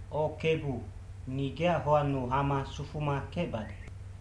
O Kebu, ni geac hoannu hama sufuma kecbade.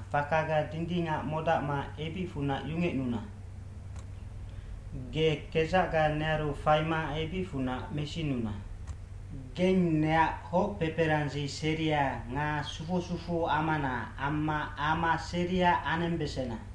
fakaga dindingac modacma ebicfunac yungecnuna. Ge kedzacga nearu faima ebicfunac mesinuna. Geng neac hoc peperandzi seria nga sufu sufuamana amma ama seria anembesena.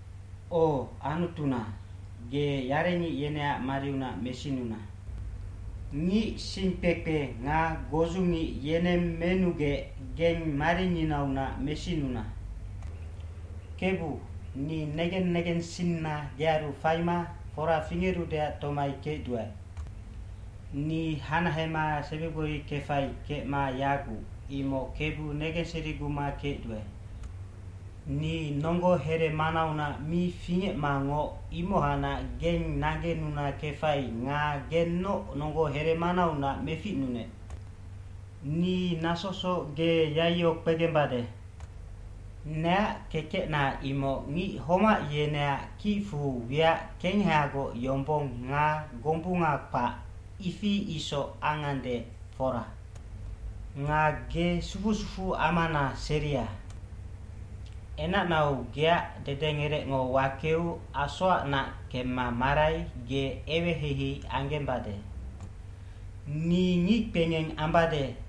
O Anutuna, ge yarengic yeneac mariunac mesinuna. Ngic singkpekpe nga godzungic yeneng menugec geng maringinaunac mesinuna. Kebu, ni negen negensinna gearu faima fora fingerudeac tomai kecduae. Ni hanahema sebigbori kefai kecma yaguc, imoc Kebu negenseriguma kecduae. Ni nonggo heremanaunac mi fingecmangoc, imohacnac geng naggenuna kefai nga gennoc nonggo heremanaunac meficnunec. Ni nasosoc ge yaiyo kpegembade. Neac kekecna imoc ngic homac yeneac kicfu wiac kengehagoc yombong nga gombunga kpac, ifi isoc angande, fora. Nga ge sufu sufuamana seria. Enacnau geac dedengerecngo wakeu asoacnac kemma marai ge eweheihei anggembade. Ni ngickpengeng ambade,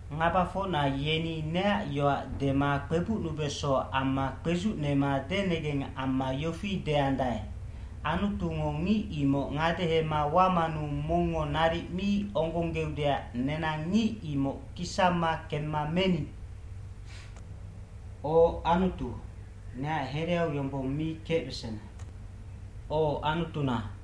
Ngabafocna yeni neac yoac dema kpebucnubeso amma kpedzucnema denengeng amma yofi deandae, “Anutungo ngic imoc ngadehema wamanu mongngo naric mi onggonggeudeac nenang ngic imoc kisamma kemma meni.” O Anutu, neac hereau yombong mi kecbesena. O Anutuna,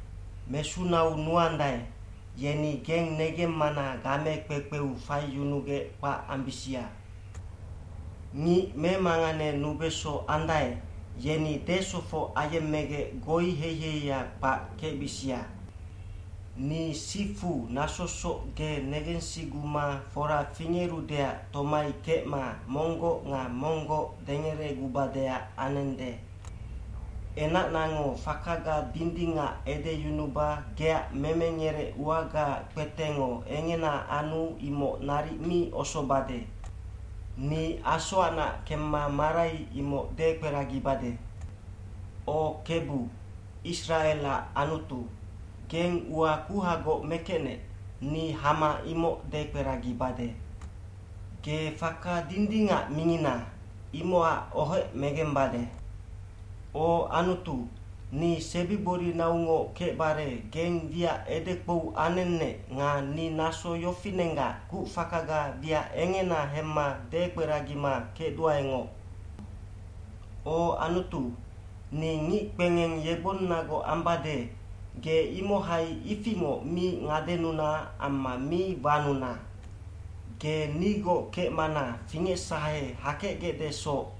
Mesunau nuandae, yeni geng negemmana game kpekpeu faiyunugec kpac ambisia. Ngic memanganenubeso andae, yeni desofoc ayemmegec goiheiheia kpac kecbisia. Ni sifu nasosoc ge negensiguma fora fingerudeac tomai kecma monggoc nga monggoc dengeregubadeac anende.e Enacnango fakaga dindingac edeyunuba geac memengerec uagaac kpetengo engena anu imoc naric mi osobade. Ni asoacnac kemma marai imoc dekperagibade. O Kebu, Isracelac Anutu, geng ua kuhagoc mekecnec, ni hama imoc dekperagibade. Ge faka dindingac mingina, imocac ohec megembade. O Anutu, ni sebigborinaungoc kecbare geng wiac edekpou anennec nga ni naso yofinenggac kucfakaga wiac engena hemma dekperagima kecduaengoc. O Anutu, ni kpengeng yegbonnagoc ambade, ge imohai ifingoc mi ngadenuna amma mi wanuna. Ge nigoc kecmana fingecsahe hakecgecdesoc,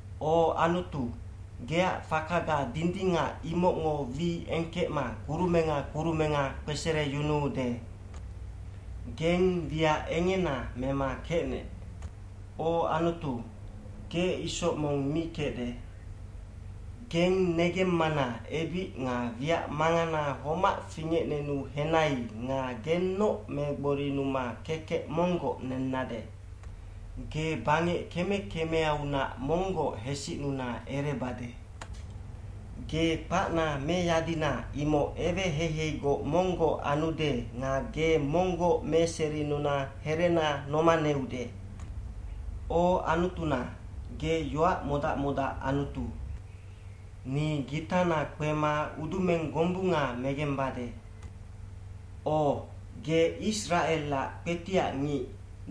O Anutu, geac fakaga dindingac imocngo wi engkecma kurumenga kurumenga kpesereyunuude. Geng wiac engena mema kecnec. O Anutu, ge isoc mong mi kecde. Geng negemmana ebic nga wiac mangana homac fingecnenu henai nga gennoc megborinuma kekec monggoc nennade. Ge bangec keme kemeaunac monggoc hesicnuna erebade. Ge kpacna meyadina imoc eweheiheigoc monggoc anude nga ge monggoc meserinuna herena nomaneude. O Anutuna, ge yoac modac modac Anutu. Ni gitana kpema udumeng gombunga megembade. O, ge Isracelac kpetiac ngic,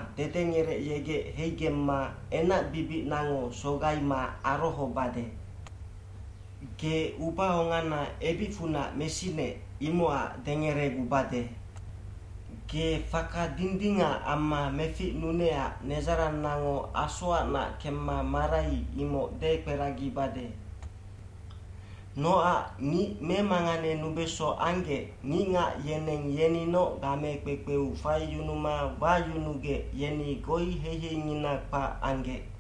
dedengerecyegec heigemma enacbibicnango sogaima arohobade. Ge ubaongana ebicfunac mesinec, imocac dengeregubade. Ge faka dindingac amma meficnunecac nedzarannango asoacnac kemma marai imoc dekperagibade. Nocac ngic memanganenubeso anggec, ngicngac yeneng yeninoc game kpekpeu faiyunuma wayunugec yeni goiheiheingina kpac anggec.